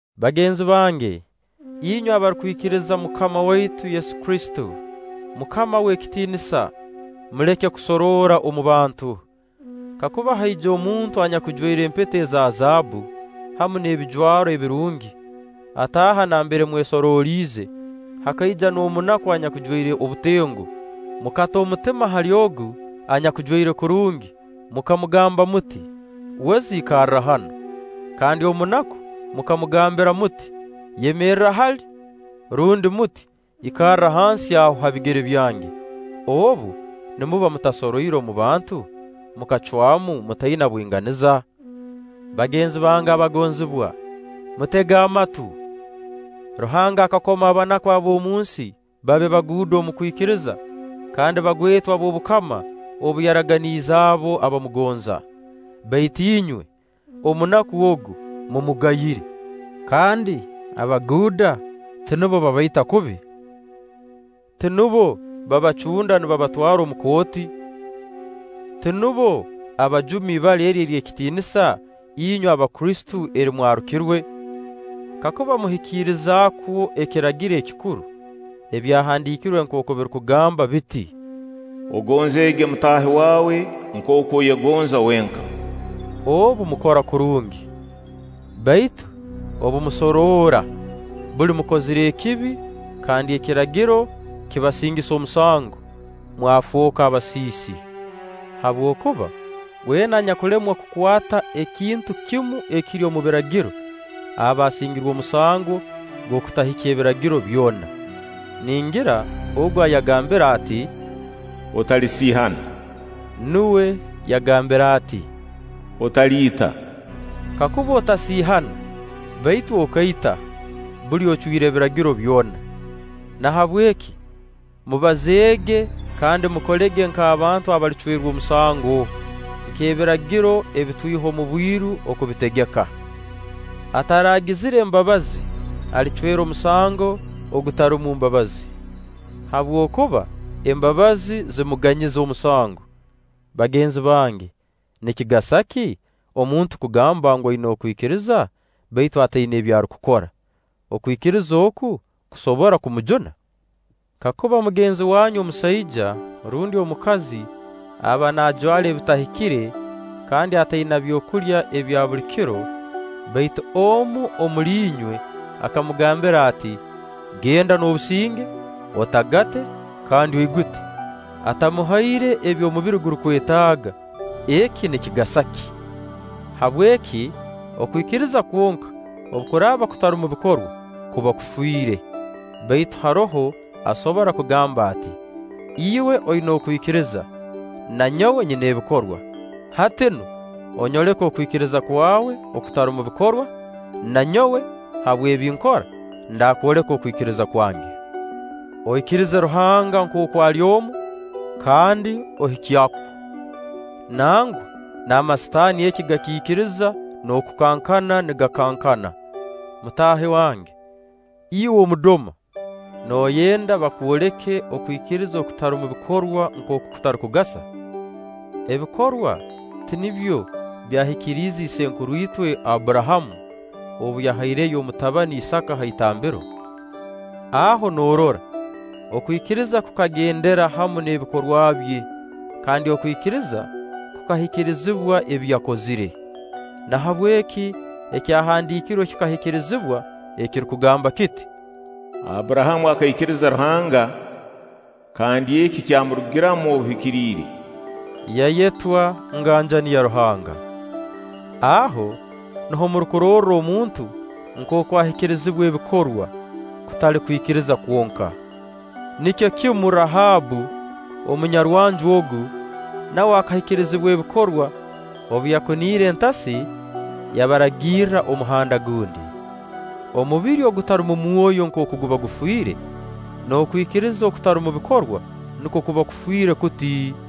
Bagenzi bange, inywe abarukwikiriza MUKAMA waitu Yesu Kristo, MUKAMA w'ekitiinisa, muleke kusoroora omu bantu. Kakuba haija omuntu anyakujwaire empeta eza zaabbu hamu n'ebijwaro ebirungi, ataaha nambere mwesoroliize; hakaija n'omunaku anyakujwaire obutengo, mukata omutima hali ogu anyakujwaire kurungi, mukamugamba muti: “Weza ikarra hanu”; kandi omunaku mukamugambira muti: “Yemerra hali”, rundi muti: “Ikarra hansi aho ha bigere byange”, obu, nimuba mutasoroire mu bantu, mukacwamu mutaina bwinganiza? Bagenzi bange abagonzibwa, mutege amatu! Ruhanga akakoma abanaku ab'omunsi babe baguuda omu kwikiriza kandi bagwetwa b'obukama obu yaraganiize abo abamugonza. Baitu inywe, omunaku ogu, mumugayire. Kandi abaguuda tinubo babaita kubi? Tinubo babacunda nibabatwara omu kooti? Tinubo abajuma ibara eri ery'ekitiinisa inywe Abakristo eri mwarukirwe? Kakuba muhikiriza kwo ekiragiro ekikuru, Ebyahandiikirwe nkooku birukugamba biti: “Ogonzeege mutaahi waawe nkooku oyegonza wenka”, obu mukora kurungi. Baitu obu musoroora, buli mukozire ekibi kandi Ekiragiro kibasingisa omusango, mwafooka basiisi. Habwokuba weena anyakulemwa kukwata ekintu kimu ekiri omu Biragiro, aba asingirwe omusango gw'okutahikya Ebiragiro byona. Ningira Ogu ayagambire ati: “Otalisiihana”, nuwe yagambire ati: “Otaliita”. Kakuba otasiihana baitu okaita, buli ocwire Ebiragiro byona. Nahabweki mubazeege kandi mukolege nk'abantu abalicwerwa omusango, nk'Ebiragiro ebitwiha omu bwiru oku bitegeka. Ataraagizire mbabazi, alicwerwa omusango ogutarumu mbabazi; habwokuba embabazi zimuganyiza omusango. Bagenzi bange, nikigasa ki omuntu kugamba ngu, aina okwikiriza, baitu ataina ebi arukukora? Okwikiriza oku kusobora kumujuna? Kakuba mugenzi wanyu omusaija rundi omukazi aba naajwara ebitahikire kandi ataina byokulya ebya buli kiro, baitu omu omuli inywe akamugambira ati: “Genda n'obusinge, otagate kandi oigute”, atamuhaire ebi omubiri gurukwetaaga, eki nikigasa ki? Habweki, okwikiriza kwonka obu kuraaba kutarumu bikorwa, kuba kufiire. Baitu haroho asobora kugamba ati: “Iwe oina okwikiriza, na nyowe nyina ebikorwa.” Hati nu onyoleke okwikiriza kwawe okutarumu bikorwa, na nyowe habw'ebi nkora, ndakwoleka okwikiriza kwange. Oikiriize Ruhanga nkooku ali omu, kandi ohikya kwo. Nangwa n'amasitaani eki gakiikiriza n'okukankana nigakankana. Mutaahi wange, iwe omudoma, nooyenda bakwoleka okwikiriza okutarumu bikorwa nkooku kutarukugasa? Ebikorwa tinibyo byahikiriize isenkuru itwe Abburahamu obu yahaireyo omutabani Isaaka ha itambiro? Aho noorora, okwikiriza kukagendera hamu n'ebikorwa bye, kandi okwikiriza kukahikirizibwa ebi yakozire. Nahabweki Ekyahandiikirwe kikahikirizibwa ekirukugamba kiti: “Abburahamu akaikiriza Ruhanga, kandi eki kyamurugiramu obuhikiriire”; yayetwa nganjani ya Ruhanga. Aho nuho murukurorra omuntu nkooku ahikirizibwa ebikorwa, kutali kwikiriza kwonka. Nikyo kimu Rahabbu, omunyarwanju ogu, nawe akahikirizibwa ebikorwa obu yakuniire entasi yabaragirra omuhanda gundi. Omubiri ogutarumu mwoyo nkooku guba gufiire, n'okwikiriza okutarumu bikorwa nukwo kuba kufiire kuti.